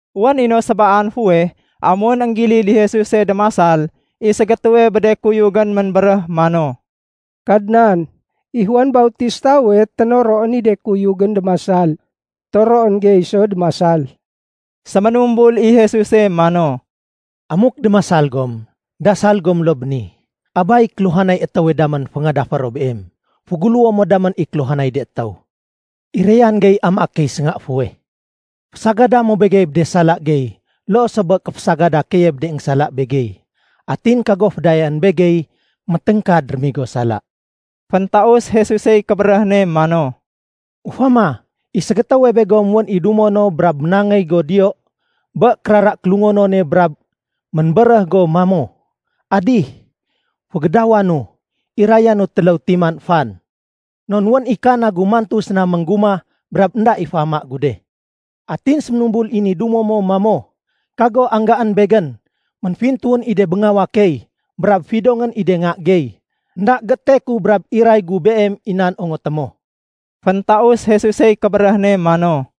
Wén i no sébaan fuweh, amun énggilid i Jesuse démasal, i ségétéwe bé de kuyugén ménbéréh mano, “Kadnan, i Juan Bautistawe ténoroén i de kuyugén démasal. Toroén gey so démasal.” Séménumbul i Jesuse mano, “Amuk démasal gom, dasal gom loo bé ni: ‘Abay, kéluhanay étéwe damén féngadafé ro Beem. Féguléwo mo damén i kéluhanay de étéw. Irayan gey amaé key sénga fuweh. Fésagada mo begey bé de sala gey loo so bé kéfésagada keye bé de énggésala begey. Atin kago fédayaén begey météngkad rémigo sala.’” Féntaus Jesusey kébéréh ne mano, “Ufama, i ségétéwe begom wén i dumo no brab ménangéy go diyo bé kérara kélungonone brab ménbéréh go mamo, ‘Adih, fégédawanu. Irayanu téléw timan fan. Non wén i kana gu mantu séna ménggumah brab énda i féama gu de.’ Atin sémumbul i ni dumo mo mano, ‘Kago anggaén begén. Ménfintuén i de béngawa key, brab fidongén i de nga gey. Enda gééteku brab iray gu beem i nan ongoté mo.’” Féntaus Jesusey kébéréh ne mano,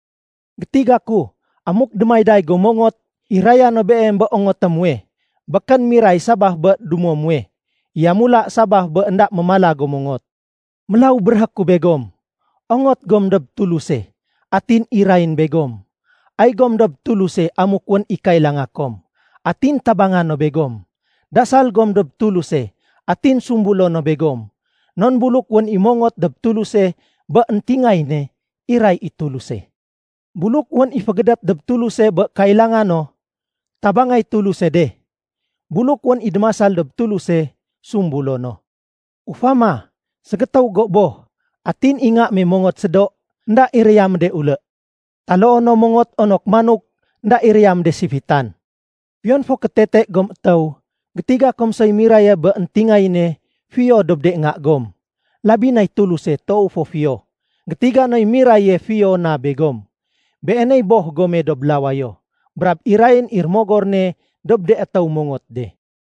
“Gétiga ku amuk démayday go mongot, iraya no beem bé ongoté muwe. Békén miray sabaf bé dumo muwe, yamula sabaf bé énda mémala go mongot. Mélaw béréhé ku begom, ongot gom dob Tuluse, atin irayén begom. Ay gom dob Tuluse amuk wén i kailanga kom, atin tabanga no begom. Dasal gom dob Tuluse atin sumbulo no begom, non buluk wén i mongot dob Tuluse bé éntingayéne, iray i Tuluse. Buluk wén i fégédét dob Tuluse bé de kailanga no, tabangay Tuluse de. Buluk wén i démasal dob Tuluse, sumbulo no. Ufama, ségétéw go boh, atin i nga me mongot sédo, énda iraya mo de ulé. Taloo no mongot onok manok, énda iraya mo de sifitan. Fiyon fo ké tete gom étéw, gétiga kom soy miraye bé éntingayéne fiyo dob de nga gom. Labi nay Tuluse toow fo fiyo, gétiga noy miraye fiyo na begom. Beeney Boh gome dob lawayo, brab irayén i Rémogor ne dob de étéw mongot de.”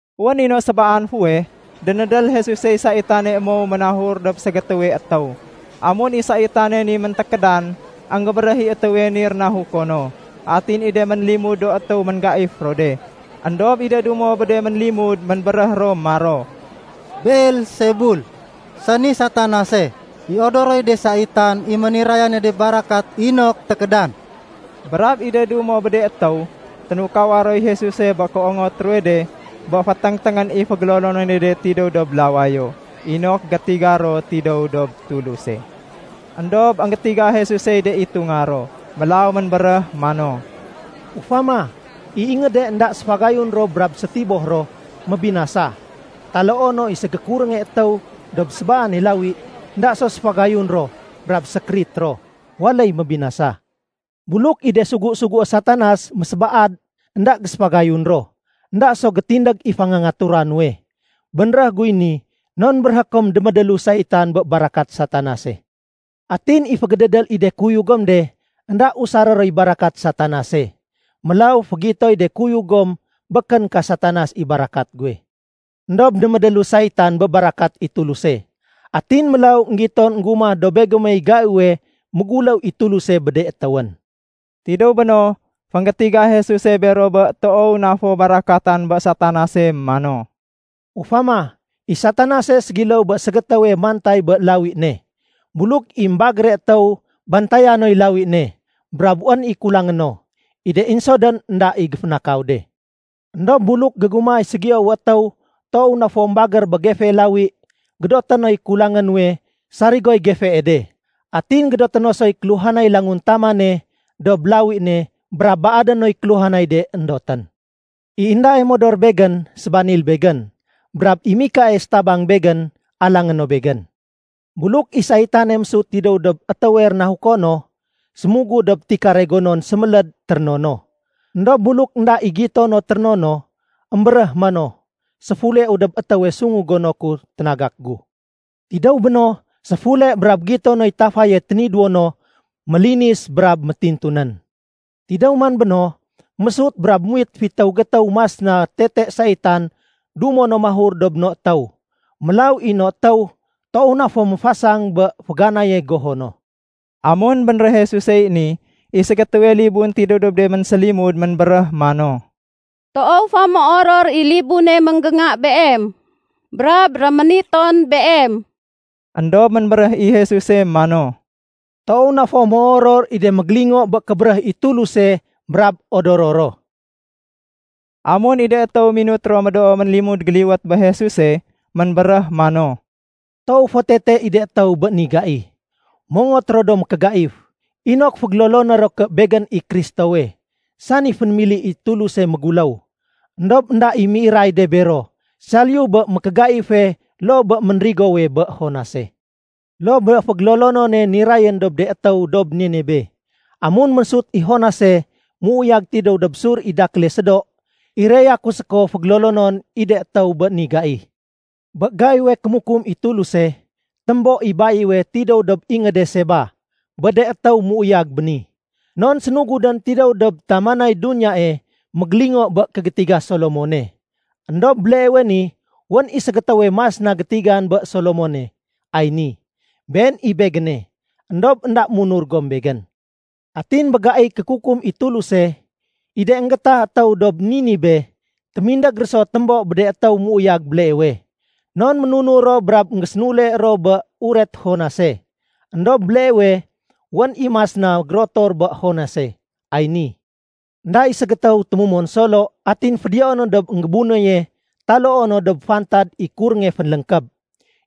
Wén i no sébaan fuweh, dénédél Jesusey saitane mow ménahur dob ségétéwe étéw. Amun i saitane ni méntékédan, énggébéréh i étéwe ni rénahuko no. Atin i de ménlimud do étéw ménggaif ro de. Endob i de dumo bé de ménlimud ménbéréh ro maro, “Beelsebul, sani Satanase, i odoroy de saitan, i ménirayane de barakat inok tékédan.” Brab i de dumo bé de étéw ténukawa roy Jesuse bé kéongot ruwe de bé féténgténgén i fégélolonone de tidéw dob lawayo, inok gétiga ro tidéw dob Tuluse. Endob énggétiga Jesusey de itunga ro, mélaw ménbéréh mano, “Ufama, i ingéde énda séfagayun ro brab sétiboh ro, mébinasa. Taloo no i ségékurénge étéw dob sébaane lawi énda so séfagayun ro brab sékérit ro, waléy mébinasa. Buluk i de sugu-sugué Satanas mésébaad énda géséfagayun ro, énda so gétindég i fangangatura nuwe. Bénréh guy ni non béréhé kom i démédélu saitan bé barakat Satanase. Atin i fégédédél i de kuyug gom de, énda usaré roy barakat Satanase. Mélaw fégitoy de kuyug gom békén ka Satanas i barakat guwe. Endob démédélu saitan bé barakat i Tuluse. Atin mélaw énggiton énggumah dob begomey gaiwe méguléw i Tuluse bé de étéwén.” Tidéw béno, fénggétiga Jesuse bero bé toow na fo barakatan bé Satanase mano, “Ufama, i Satanase ségiléw bé ségétéwe mantay bé lawi ne. Buluk i émbagére étéw bantaya noy lawi ne, brab wén i kulangé no, i de insodén énda i géfénakaw de. Endob buluk gégumah i ségiyowe étéw toow na fo émbagér bé gefee lawi, gédoté noy kulangé nuwe sarigoy gefee de. Atin gédoté no soy kéluhanay languntamane dob lawi ne brab baade noy kéluhanay de éndotén. “I éndae modor Begén, sébanil Begén. Brab i mikae sétabang Begén, alangé no Begén. “Buluk i saitane mésut tidéw dob étéwe rénahuko no, sémugud dob tikare gonon séméléd téréno no. Endob buluk énda i gito no téréno no, émbéréh mano, ‘Séfuleu dob étéwe sungu gono ku ténagak gu.’ Tidéw béno, séfule brab gito noy tafaye ténidéwo no mélinis brab métintu nén. Tidéw man béno, mésut brab muwit fitéw gétéw mas na tete saitan dumo no mahur dob no étéw. Mélaw i no étéw toow na fo méfasang bé féganaye goho no.” Amun bénréh Jesusey ni, i ségétéwe libun tidéw dob de ménsélimud ménbéréh mano, “Toow fo méoror i libune ménggénga Beem brab réméniton Beem.” Endob ménbéréh i Jesuse mano, “Toow na fo méoror i de mégélingo bé kébéréh i Tuluse brab odoro ro.” Amun i de étéw minut ro médoo ménlimud géliwét bé Jesuse, ménbéréh mano, “Toow fo tete i de étéw bé ni gai. Mongot ro do mékégaif inok fégéloloné ro ké Begén i Kristowe, sani fénémili i Tulus méguléw. Endob énda i méiray de bero saliyu bé mékégaife loo bé ménrigowe bé Jonase. Loo bé fégélolonone nirayén dob de étéw dob Ninibé amun ménsut i Jonase méuyag tidéw dob sur i dakéle sédo, iraya ku séko fégélolonon i de étéw bé ni gai. Bé gaiwe kémukum i Tuluse, témbo i baiwe tidéw dob ingéde Séba bé de étéw méuyag béni. Non sénugudén tidéw dob tamanay duniyae mégélingo bé kégétiga Solomone. Endob béleewe ni wén i ségétéwe mas na gétigan bé Solomone ay ni, been i Begéne, éndob énda munur gom Begén. Atin bé gaiy kékukum i Tuluse, i de énggétah étéw dob Ninibé témindég ro so témbo bé de étéw méuyag béleewe. Non ménunur ro brab énggésénule ro bé uret Jonase. Endob béleewe wén i mas na gérotor bé Jonase ay ni. “Enda i ségétéw témumon solo atin fédiyoé no dob énggébunéye taloo no dob fantad i kurénge fénléngkéb.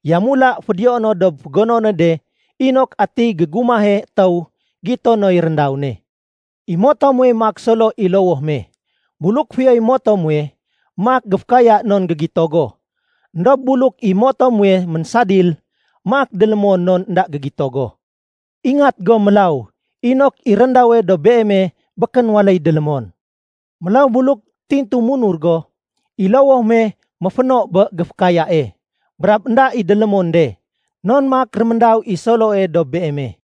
Yamula fédiyoé no dob fégonone de inok atiy gégumahe étéw gito noy réndaw ne. I moto muwe maak solo i lowoh me. Buluk fiyoy moto muwe, maak géfékaya non gégito go. Endob buluk i moto muwe ménsadil, maak délémon non énda gégito go. Ingat gom mélaw inok i réndawe dob beeme békén waléy délémon. Mélaw buluk tintu munur go, i lowoh me méféno bé géfékayae, brab énda i délémon de, non maak réméndaw i soloe dob beeme.”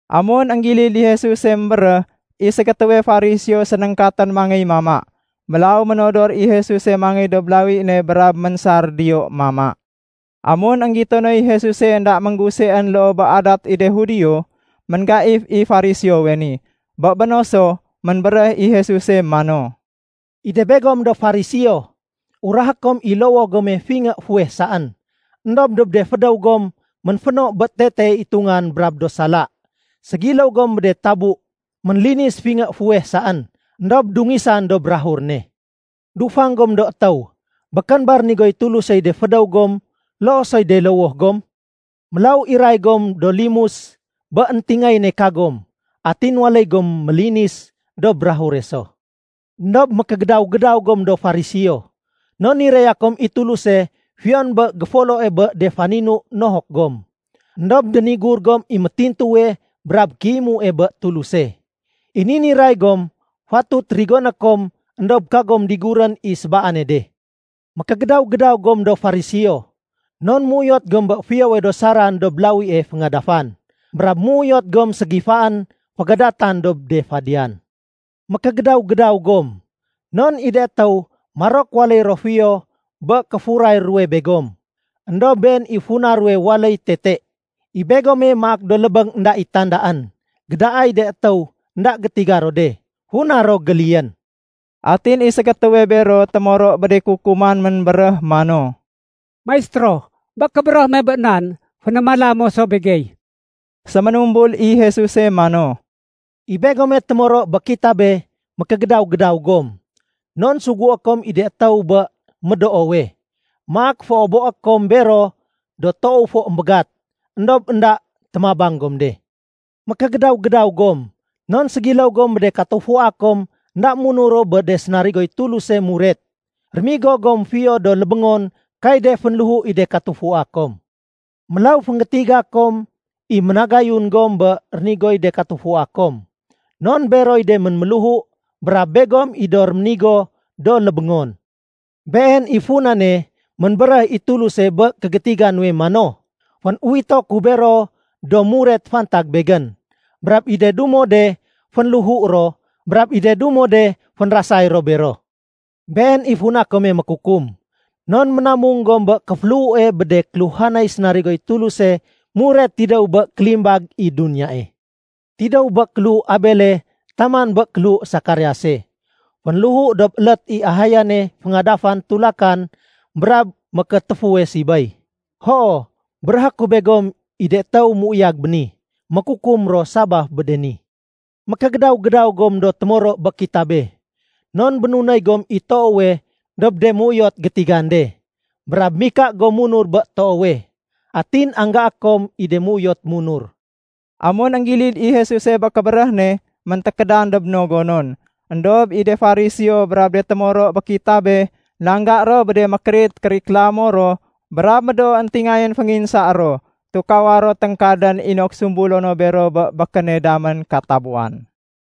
Amun énggilid i Jesuse émbéréh, i ségétéwe Fariseo sénéngkatén mangéy mama. Mélaw ménodor i Jesuse mangéy dob lawi ne brab ménsar diyo mama. Amun énggito noy Jesuse énda méngguseén loo bé adat i de Judio, ménggaif i Fariseowe ni. Bé béno so, ménbéréh i Jesuse mano, “I de begom do Fariseo, urahé kom i lowoh gome fingé fuweh saén. Endob dob de fédéw gom ménféno bé tetee itungan brab do sala. Ségiléw gom bé de tabu ménlinis fingé fuweh saén, éndob dungisan dob bukag ne. Dufang gom do étéw. Békén ba rénigoy Tulusey de fédéw gom loo soy de lowoh gom? Mélaw iray gom do limus bé éntingayéne kagom atin waléy gom mélinis dob bukage so. “Endob mékégédaw-gédaw gom do Fariseo non niraya kom i Tuluse fiyon bé géfoloe bé de faninu nohok gom, éndob dénigur gom i métintuwe brab kéimue bé Tuluse. I ni niray gom fatut rigoné kom éndob kagom digurén i sébaane de. “Mékégédaw-gédaw gom do Fariseo non méuyot gom bé fiyowe do saran dob lawie féngadafan. Brab méuyot gom ségifaén fégadatan dob de fadiyan. Mékégédaw-gédaw gom non i de étéw marok waléy ro fiyo bé kéfuray ruwe begom, éndob been i funa ruwe waléy tete. I begome maak do lébéng énda i tandaén, gédaay de étéw énda gétiga ro de, funa ro géliyén.” Atin i ségétéwe bero témoro bé de kukuman ménbéréh mano, “Maistéro, bé kébéréh me bé nan, fénémala mo so begey.” Séménumbul i Jesuse mano, “I begome témoro bé kitabe, mékégédaw-gédaw gom, non sugué kom i de étéw bé médoowe. Maak féoboé kom bero do toow fo émbégat, éndob énda témabang gom de. Mékégédaw-gédaw gom non ségiléw gom bé de katufua kom énda munur ro bé de sénarigoy Tuluse muret. Rémigo gom fiyo do lébéngon kay de fénléhu i de katufua kom. Mélaw fénggétiga kom i ménagayun gom bé rénigoy de katufua kom non beroy do ménméléhu brab begom i do rémigo do lébéngon. Been i funane ménbéréh i Tuluse bé kégétiga nuwe mano, ‘Fén-uwito ku bero do muret fantag Begén, brab i de dumo de fénléhu ro brab i de dumo de fénrasay ro bero.’ “Been i funa kome mékukum, non ménamung gom bé kéféléhue bé de kéluhanay sénarigoy Tuluse muret tidéw bé kélimbag i duniyae. Tidéw bé kéléhu Abele taman bé kéléhu Sakariase, fénléhu dob élét i ahayane féngadafan tulakan brab mékétéfuwe sibéy. Hoo, béréhé ku begom i de étéw méuyag béni, mékukum ro sabaf bé de ni. “Mékégédaw-gédaw gom do témoro bé kitabe, non bénunéy gom i toowe dob de méuyot gétigan de. Brab mika gom munur bé toowe, atin anggaé kom i de méuyot munur.” Amun énggilid i Jesuse bé kébéréh ne, méntékédan dob no gonon, éndob i de Fariseo brab de témoro bé kitabé nangga ro bé de mékérit kériklamo ro brab médoo éntingayén fénginsaé ro tukawa ro téngkadén inok sumbulo no bero bé békéne damén katabuwan.